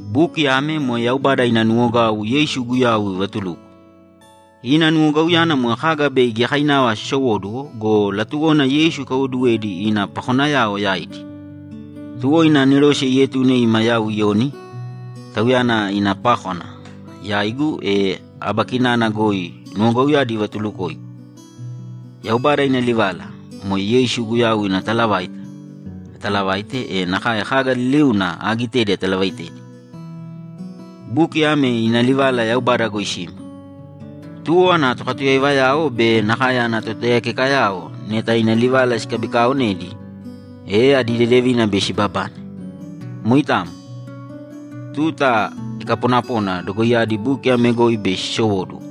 Buki ame moe Yaubada ina nuwogau Yeisu Guyau ivatuluko. Ina nuwogauyana moe kaga bei giyakainava sisowóduwo go, latuwona Yeisu ikaiwoduwedi ina pakonayao yaidi. Tuwo ina anerose ietune ima yau Iyoni, Tauyana ina pákwana, yaigu, e aba kinana goi nuwogauyadi ivatulukoigu. Yaubada ina livala, moe Yeisu Guyau ina talavaita, atalavaite, e nakae kaga liliuna aagitedi atalavaitedi. Buki ame ina livala Yaubada goi sima. Tuwo ana tokatuyaivayao be nakae ana totaiyakekayao neta ina livala sikabikaaonedi, e adi dedevina bei sibabane. Moitamo. Tuta ikaponapona dogoiyadi buki ame goi bei sisowóduwo,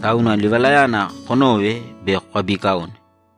tauna livalayana konōve be kokabiikaōne.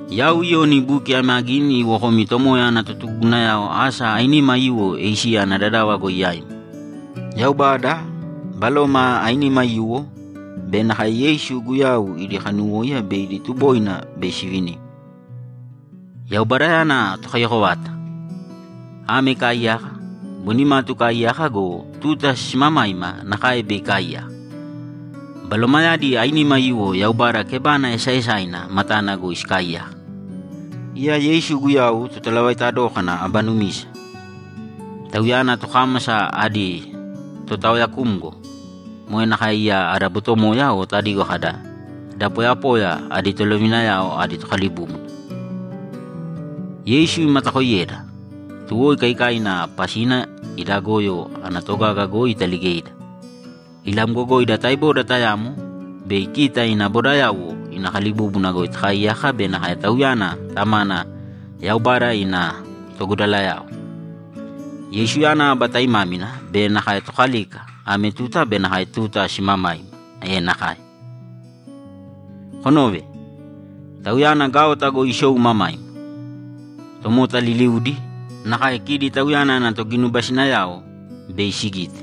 Yau Iyoni buki ame agini iwo komi Tomoya ana totugugunayao asa ainima aiyuwo Esiya ana dadava goi yaimi. Yaubada, Baloma ainima aiyuwo, be nakae Yeisu Guyau idi kanuwóiya be idi tuboina bei sivinimi. Yaubadayana Tokaiyako vata: Ame ikaaiyaka, boi nimatu ikaaiyaka go, tuta simamaima nakae bei ikaaiyaka. Balomayadi ainima aiyuwo Yaubada kebana esaaesaina matana goi sikaaiyaka. Iya Yeisu Guyau Totalavaita dókana aba numisa. Tauyana tokámasa adi Totaoyakumgo. Moe nakae iya ada botomoya o tadigo kada, ‘Da poyapoya adi tolovinayao adi Tokalibúbuna.’ Yeisu imatakooiyeda, tuwo ikaikaina pasina ida goyo ana togaga goi italigeida. Ilamgogoida taeboda tayamo bei kita ina bodayauwo ina kalibúbuna goi takaaiyaka be nakae Tauyana Tamana Yaubada ina togudalayao. Yeisuyana aba taimámina be nakae Tokalika ame tuta be nakae tuta simamaima! E nakae! Konōve! Tauyana gaota goi isou imamaima. Tomota liliudi, nakae kidi Tauyana ana toginubasinayao, bei sigite.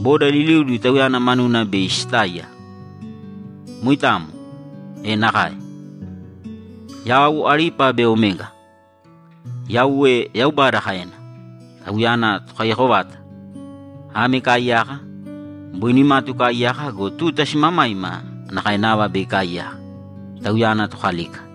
Boda liliudi Tauyana manuna bei sitáiya. Moitamo! E nakae! ‘Yau Alipa be Omega’, Yauwe Yaubada kaena. Tauyana Tokaiyako vata: Ame ikaaiyaka, boi nimatu ikaaiyaka go, tuta simamaima nakae nava bei ikaaiyaka. Tauyana Tokalika.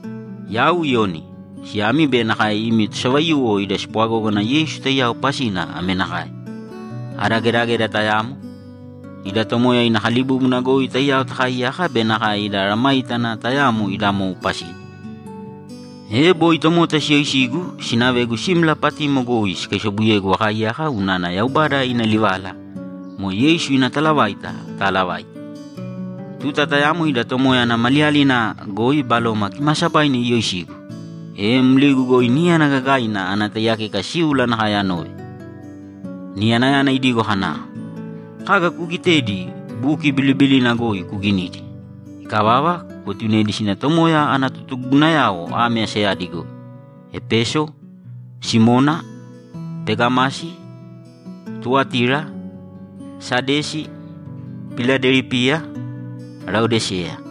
Yau Iyoni, siyami be nakae imi tosavaiyuwo ida spwagógana Yeisu taiyao pasina ame nakae: Ada gedageda tayamo, ida Tomoya ina kalibúbuna goi taiyao takaaiyaka be nakae ida mesayágana tayamo ida mou pasina. E, boi tomota siyoisigu, sinavegu simla Patimo goi sikaisobuyegu akaaiyaka unana Yaubada ina livala, moe Yeisu ina talavaita, ataalavaite. Tuta tayamo ida Tomoya ana maliyalina goi Baloma Kimaasabaina iyoisigu, e mligu goi níyana gagaina ana taiyakeka síula nakae anove. Niyanayana idigo kana, ‘Kaga kuugitedi buki bilibilina goi kuginīdi. Ikavava, kuetunēdi sina Tomoya ana totugugunayao ame asayadi goi: Epeso, Simona, Pegamasi, Tuwatira, Sadesi, Piladelipiya, Laodiseya.’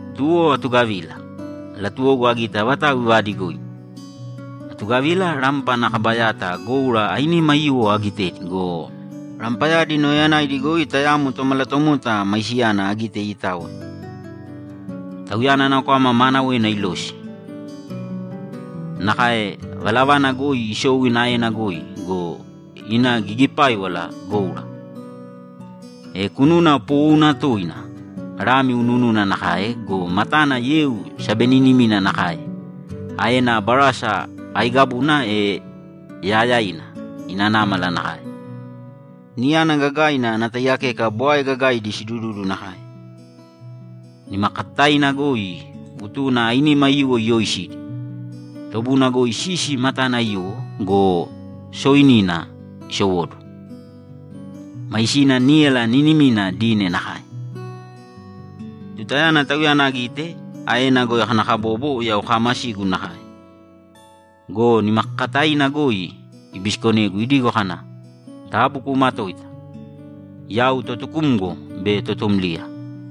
Tuwo atugavila; latuwogu agite avatau ivaadigoigu. Atugavila, rampa ana kaba yata goura ainima aiyuwo agitedi go, rampayadi nauyayanaidi goi tayamo tomalatomota maisiyana agite iitaoya. Tauyana ana kwama maanawena ilosi, nakae valavana goi isou ina aena goi go, ina gigipáiwala goura. E kununa poowouna tooina lami unuununa nakae go, matana yeu sabeninimina nakae. Aena barasa aiigabuna e yaayaina ina námala nakae. Niyana gagaina ana taiyakeka bwae gagaidi sidududu nakae. Nimakakataina goi utuna ainima aiyuwo iyooisidi. Tobuna goi sisi matana aiyuwo go, sooinina isowóduwo. Maisina níyala niinimina dine nakae. Tutayana Tauyana agite, aena goi akanakabobo yau kaamasigu nakae. Go nimakakataina goi ibisikonegu idigo kana, ‘Taabu kuumatōita. Yau Totukumgo be Totumliya.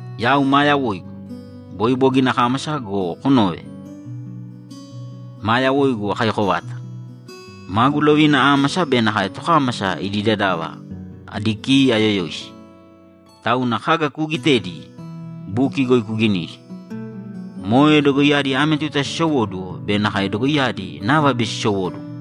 Yau maa yawoigu. Boi bogina akámasa go, kunōve, maa yawoigu akaiyako vata. Magu lovina ámasa be nakae tokámasa idi dadava adi ki ayoyoisi. Tauna kaga kuugitedi buki goi kuginīdi. Moe dogoiyadi ame tuta sisowóduwo be nakae dogoiyadi nava bei sisowóduwo.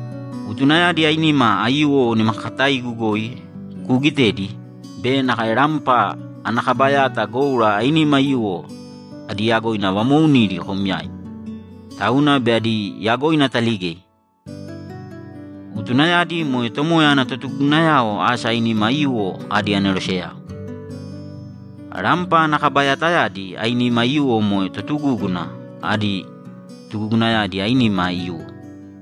Utunayadi ainima aiyuwo nimakakataigu goi kuugitedi be nakae rampa ana kaba yata goura ainima aiyuwo adi yagoina vamoounidi kom yaim, tauna bei adi yagoina ataligei. Utunayadi moe Tomoya ana totugugunayao asa ainima aiyuwo adi aneroseyao. Rampa ana kaba yatayadi ainima aiyuwo moe totugúguna adi tugugunayadi ainima aiyuwo.’